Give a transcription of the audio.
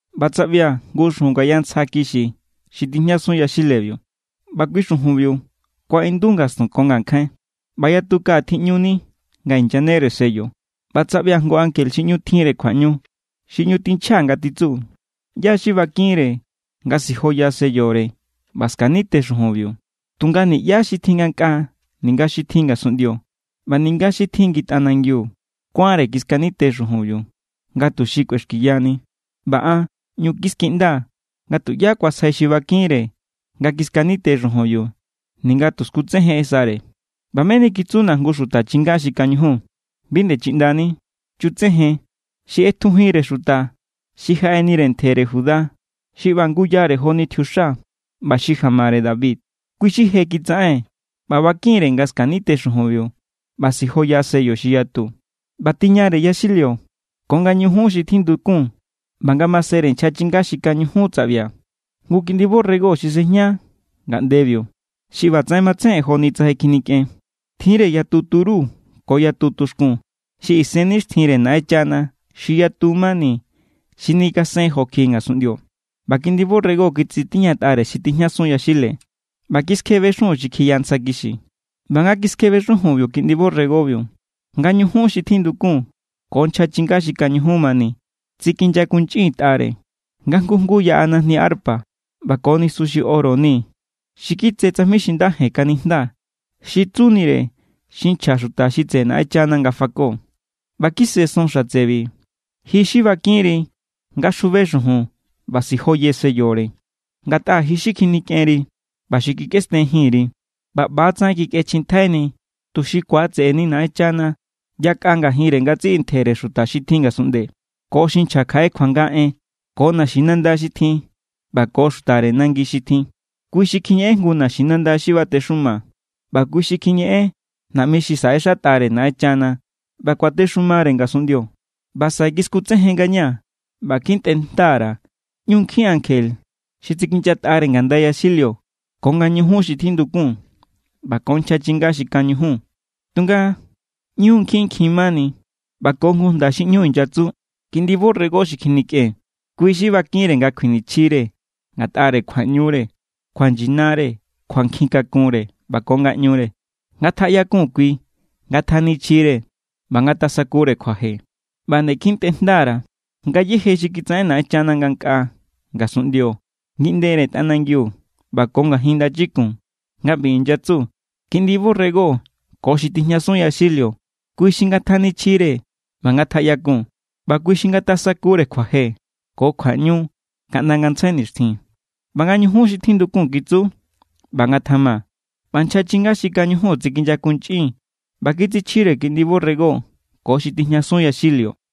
ꞌBa tsaꞌbia̱ jngu xujun ngaya ntsja kixi xi tijñasun yaxilebiu. ꞌBa kui xujunbiu kuaꞌindu ngastun ko ngankjain, ꞌba yatu kaꞌa tjiꞌñuni nga inyanere sello. ꞌBa tsaꞌbia̱ jngu ankje xi ꞌñu tjinre kjuaꞌñu, xi ꞌñu tinchja nga titsu: “¿ꞌYá= xi bakinre nga sijoya sellore ꞌba skanite xujunbiu?” Tunga niꞌyá xi tjin ngankꞌaa ninga xi tjin ngasunꞌndio ꞌba ninga xi tjin ngi tꞌanangiu kuánre kiskanite xujunbiu, nga tuxi kꞌuexkiyani. ꞌBa an ꞌñu kiskiꞌndaa̱, nga tuꞌyá kuasjai xi bakinre nga kiskanite xujunbiu ninga tu skutsejensare. ꞌBa meni kitsuna̱ jngu xuta chinga xi kañujun: “Bi nde chiꞌndani. Chutsejen. Xi ꞌetjujinnire xuta xi jaꞌenire ntjere Judá, xi ꞌba nguyare joni tjiuxa, ꞌba xi jamare David, kui xi je kitsaꞌen ꞌba bakin=re̱ nga skanite xujunbiu ꞌba sijoya sello xi yatu.” ꞌBa tiñare yaxilio ko nga ñujun xi tjindukun ꞌba ngamasenre nchja chinga xi kañujun tsaꞌbia̱ jngu Kiꞌndi borrego xi sejña ngaꞌndebiu, xi ꞌbatsaꞌen matsejen joni tsa je kjinikꞌen. Tjinre yatu turu ko yatu tuxkun xi isennixtjinre Naꞌenchana xi yatu mani xi nikasen jo kjiꞌi ngasunꞌndio. ꞌBa Kiꞌndi borrego kitsitiñatꞌare xi tijñasun yaxile ꞌba kiskjebe xujun xi kjiya ntsja kixi. ꞌBa nga kiskjebe xujunbiu Kiꞌndi borregobiu, nga ñujun xi tjindukun ko nchja chinga xi kañujun mani tsikinyakunchꞌintꞌare. Nga jngu jngu yaꞌa najni arpa ꞌba ko nisu xi oro ni xi kitse tsajmi xi nda jen kanijnda, xi tsunire xi nchja xuta xi tseꞌe Naꞌenchana nga fako. ꞌBa kise son xatsebi: Ji xi bakinri nga xjube xujun ꞌba sijoye sellore, ngatꞌa ji xi kjinikꞌenri ꞌba xi kikꞌesten jinri, ꞌba ꞌba=tsaꞌen kikꞌechjintjaini tuxi ku̱atse̱ꞌe̱ni Naꞌenchana yakꞌa ngajinre ngatsiꞌi ntjere xuta xi tjin ngasunꞌnde, ko xi nchja kjaꞌe kjuanga en, ko naxinanda xi tjin, ꞌba ko xutare nangi xi tjin. Kui xi kjiñeꞌen jngu naxinanda xi batexuma, ꞌba kui xi kjiñeꞌen naꞌmi xi saꞌexatꞌare Naꞌenchana. ꞌBa kuatexumare ngasunꞌndio. ꞌBa saꞌe kiskutsejen ngañaa̱ ꞌba kjintꞌe jnda_ra̱ ꞌñu nkjin ankje xi tsikinyatꞌa ngandaire yaxilio ko nga ñujun xi tjindukun ꞌba ko nchja chinga xi kañujun. Tunga ꞌñu nkjinnkjin= mani. ꞌBa ko jngu jnda xi ꞌñu inyatsu: Kiꞌndi borrego xi kjinikꞌen, Kui= xi bakinre nga kjuinichjire ngatꞌare kjuaꞌñure, kjuanyinare, kjuankjin kakunre, ꞌba ko ngaꞌñure. Ngatjaꞌyakun kui, ngatjanichjire, ꞌba ngatasakure kjuaje. ꞌBa nde kjintꞌe jnda_ra̱ ngayéje xi kitsaꞌen Naꞌenchana ngankꞌaa, ngasunꞌndio, ngiꞌndere tꞌanangiu ꞌba ko ngajin ndachikun, nga ꞌbi inyatsu: Kiꞌndi borrego ko xi tijñasun yaxilio, kui xi ngatjanichjire ꞌba ngatjaꞌyakun, ꞌba kui xi ngatasakure kjuaje ko kjuaꞌñu kaꞌnda ngantsjai nixtjin. ꞌBa nga ñujun xi tjindukun kitsu: “¡ꞌBa ngatjama!” ꞌBa nchja chinga xi kañujun tsinyakunchꞌin ꞌba kitsichjire Kiꞌndi borrego ko xi tijñasun yaxilio.